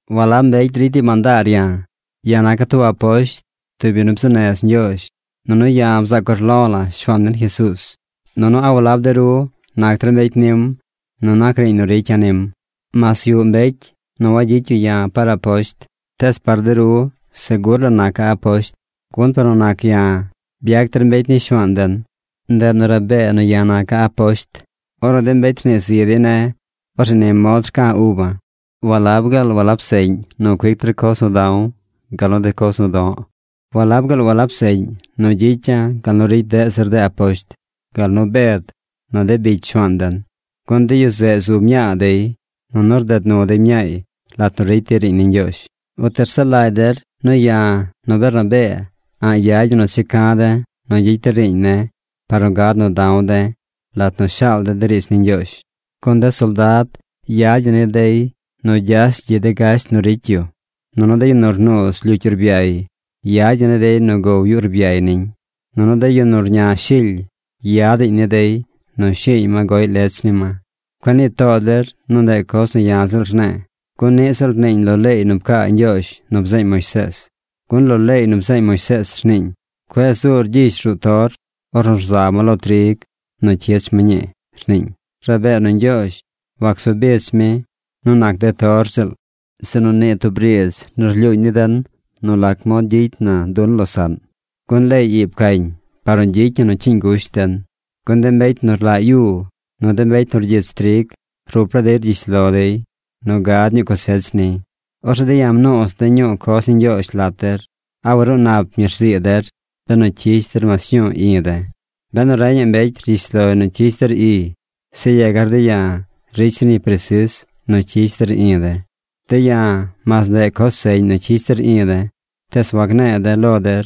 Walab mbecy ricy dey mandaar ya̱. Ya̱ naca̱ tub aposht, tub yu nu bzuu nez Ñgyoozh. Nunu ya̱ bzaac urlo̱ la̱ Shuaan den Jesuuz. Nunu ¿a walab de ru nac der mbecy nim nu nac riiñ nu ricya̱ nim? Mas yuꞌ mbecy nu wagyicy yu ya̱ par aposht, tees par de ru segur la naca̱ aposht, gun par nu nac ya̱, byac der mbecy ni Shuaan den. Ndeꞌ nu rabee nu ya̱ naca̱ aposht. Ornu de mbecy rnii zi dey ne̱, orzeꞌ ni mod rca̱ uba̱: ¿Walab gaal walab seꞌñ nu cuic der coz nu da̱w gal nu de coz nu do̱ꞌ? ¿Walab gaal walab seꞌñ nu gyicya̱ gal nu ricy deꞌ zir de aposht, gal nu Bed, nu de bicy Shuaan den? Gun de yu zeꞌ zu mñaa dey, nunu rded nu dey mñaay lat nu ricy dey riiñ ni Ñgyoozh. ¿Uti rsaꞌ lagy der nu ya̱ nu Bernabee a̱ꞌ yad ñi nu checa̱ de̱ nu gyicy de̱ riiñ ne̱ par nu gad nu da̱w de̱ lat nu shaal de̱ de riidz ni Ñgyoozh? Gun de soldad yad ñi ni dey nu gyash gyiꞌ de gasht nu ricy yu. Nunu de yu nu rnuuz lyucy urbyay yad ñi ni dey nu gow yu urbyay niñ. Nunu de yu nu rña shily yadaꞌñ ni dey nu shi̱i̱y ma goꞌy lech ni ma. Cueꞌ nii too der nu ndeꞌ coz nu ya̱ ziꞌl rne̱e̱, gun niꞌ ziꞌl rniiñ lo leey nu pcaa Ñgyoozh nu bzeeñ Moisees. Gun lo leey nu bzeeñ Moisees rniiñ: “Cueꞌ zuur gyish ruꞌ toor ornu rza ma lo trig nu cyich ma ñii”, rniiñ. Rabee nu Ñgyoozh wacsu bich mi nu nac de tor ziꞌl, sinu nii tub riidz nu rlyuuñ ni den nu lac mod gyicy na nu losaꞌn. Gun leey ii pcañ par nu gyicy ñi nu cyiiñ gusht den. Gun de mbecy nu rlaꞌ yu, nu de mbecy nu rgyich trig, rup laa dey rgyish lo dey nu gad ñuu cosech niy. Orzeꞌ de̱ ya̱ mnuuz de̱ ñuu coz ni Ñgyoozh lat der. ¿A waruu nap ñi rzii der benu cyish der mas ñuu i̱ de̱? Benu reñaꞌ mbecy rgyish loy nu cyish der iy, zeꞌ yegar de̱ ya̱ ricy zir ñi presis nu cyish der i̱ de̱. De̱ ya̱ mas ndeꞌ coz seꞌñ nu cyish der i̱ de̱, tees wanne̱e̱ de̱ lo der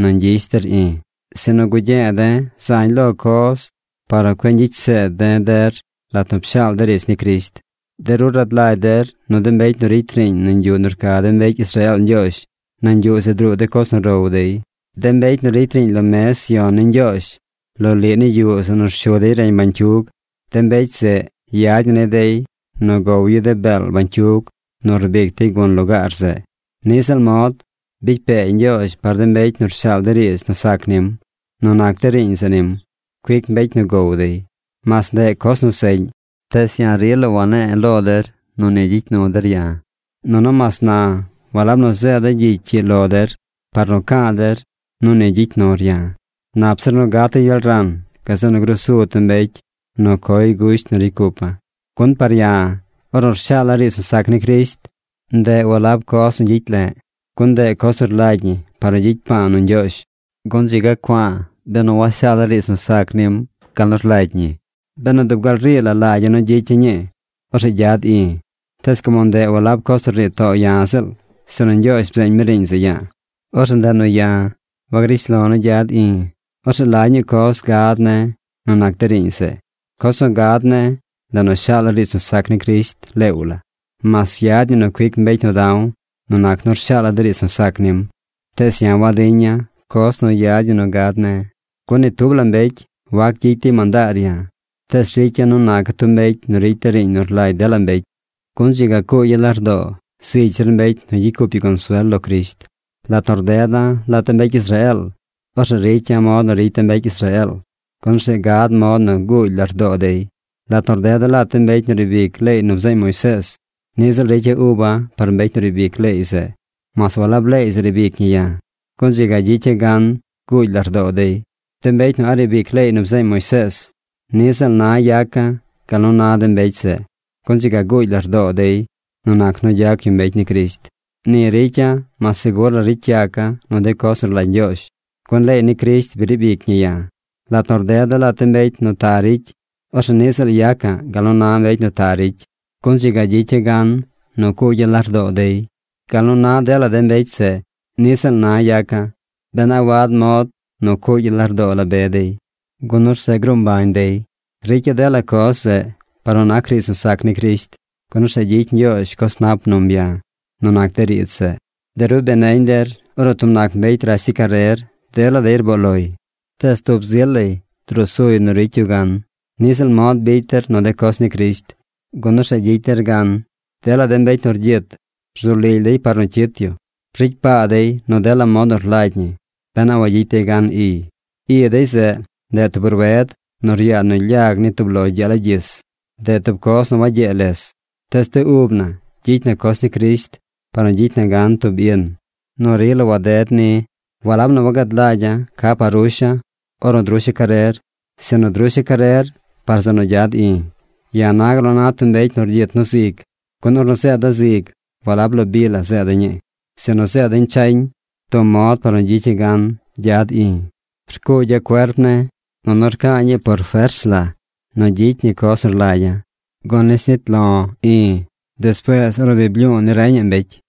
nu ñgyish der i̱. Sinu gugye̱e̱ de̱ zañ lo coz par nu cueꞌ ñgyicy zeed de̱ der lat nu pshaal de̱ riidz ni Crisht. De ru rad lagy der nu de mbecy nu ricy riiñ nañ yuꞌ nu rca de mbecy Israeel Ñgyoozh, nañ yuꞌ zeꞌ druu de coz nu row dey. De mbecy nu ricy riiñ lo mez yon ni Ñgyoozh lo liꞌ ni yuꞌ zeꞌ nu rshu dey reñ bañcyug, de mbecy zeꞌ yad ñi ni dey nu gow yu de beel bañcyug nu rbic dey gun lugaar zeꞌ. Niꞌ ziꞌl mod, bicy pee Ñgyoozh par de mbecy nu rshaal de riidz nu sac nim. Nu nac de riiñ zeꞌ nim, cuic mbecy nu gow dey. Mas ndeꞌ coz nu seꞌñ, tees ya̱ rila wanne̱e̱ lo der nu ni gyicy nu der ya̱. Nunu mas na walab nu zeeda̱ gyicy ii lo der par nu ca̱a̱ der nu ni gyicy nur ya̱. ¡Nap zir nu gata̱ gyel ran, gazeꞌ nu grusu tub mbecy nu coy gusht nu ricy cupa̱! Gun par ya̱, ornu rshaala̱ riidz nu sac ni Crisht, ndeꞌ walab coz nu gyicy le̱ꞌ, gun ndeꞌ coz nu rlagy ñi par nu gyicy pa̱a̱ nu Ñgyoozh. Gun ¡dzi ga cua̱a̱ benu washaala̱ riidz nu sac nim gal nu rlagy ñi! Benu dub gal rii la lagya̱ nu gyicya̱ ñii, orzeꞌ gyad i̱. Tees como ndeꞌ walab coz nu rnii to̱o̱ ya̱ ziꞌl, sinu Ñgyoozh bzeeñ mi riiñ zeꞌ ya̱a̱, orzeꞌ ndeꞌ nu ya̱ wagrish lo̱ nu gyad i̱. Orzeꞌ ¿la ñuu coz gad ne̱ nu nac de riiñ zeꞌ? Coz nu gad ne̱, ndeꞌ nu shaala̱ riidz nu sac ni Crisht leew la. Mas yad ñi nu cuic mbecy nu da̱w nu nac nu rshaala̱ de riidz nu sac nim, tees ya̱ wadiña̱ coz nu yad ñi nu gad ne̱. Gun ni tub la mbecy wac gyicy dey mandaar ya̱, tees ricya̱ nu naca̱ tub mbecy nu ricy de riiñ nu rlagy dela mbecy, gun dzi ga cuugya̱ lardoo zigy zir mbecy nu gyicy cup yu consuel lo Crisht. Lat nu rdeda̱ lat de mbecy Israeel, orzeꞌ ricya̱ mod nu ricy de mbecy Israeel, gun orzeꞌ gad mod nu guugy lardoo dey. Lat nu rdeda̱ lat de mbecy nu riib ic leey nu bzeeñ Moisees, niꞌ ziꞌl ricya̱ uba̱ par mbecy nu riib ic leey zeꞌ, mas walab leey zeꞌ riib ic ñi ya̱, gun dzi ga gyicya̱ gan guugy lardoo dey. De mbecy nu a̱ꞌ riib ic leey nu bzeeñ Moisees, niꞌ ziꞌl na yaca̱ gal nu na de mbecy zeꞌ, gun dzi ga guugy lardoo dey nu gyac yu mbecy ni Crisht. Ni ricya̱ mas segur la ricy yaca̱ nu de coz nu rlagy Ñgyoozh, gun leey ni Crisht bi riib ic ñi ya̱. Lat nu rdeda̱ lat de mbecy nu ta ricy, orzeꞌ niꞌ ziꞌl yaca̱ꞌ gal nu na mbecy nu ta ricy, gun dzi ga gyicya̱ gan nu cuugya̱ lardoo dey. Gal nu na dela de mbecy zeꞌ, niꞌ ziꞌl na yaca̱, ben a wad mod nu cuugya̱ lardoo la be dey, gun orzeꞌ gruu mbañ dey. Ricya̱ dela coz zeꞌ par nu nac riidz nu sac ni Crisht, gun orzeꞌ gyicy Ñgyoozh coz nap num ya̱ nu nac de riidz zeꞌ. De ru bi neñ der ornu tub nac mbecy rash dey carer, dela dey rboo loy. Tees tub zi lay drusuy nu ricy yu gan. Niꞌ ziꞌl mod bicy der nu de coz ni Crisht, gun orzeꞌ gyicy der gan. Dela de mbecy nu rgyit, rzu lily dey par nu cyit yu. Ricy paa dey nu dela mod nu rlagy ñi ben a wayicy dey gan iy. I dey zeꞌ, ndeꞌ tub rued nu ryaa nu lyag ni tub lo gyee lagyis. Ndeꞌ tub coz nu wagyee les. Tees de ub na gyicy na coz ni Crisht par nu gyicy na gan tub in nu rila waded ni. Walab nu wagad lagya̱ ca par rusha̱ ornu drusha̱ carer, sinu drusha̱ carer par zeꞌ nu gyad i̱. Ya̱ na gal na tub mbecy nu rgyit nu zig. Gun ornu zeeda̱ zig walab lo bi la zeeda̱ ñii, sinu zeeda̱ñ chañ tub mod par nu gyicya̱ gan gyad i̱. Rcuugya̱ cuerp ne̱, nunu rca̱a̱ ñii por fers la nu gyicy ñi coz nu rlagya̱. Gun nis nit lo̱ i̱ despuees ornu bi blyu̱u̱ ni reñaꞌ mbecy.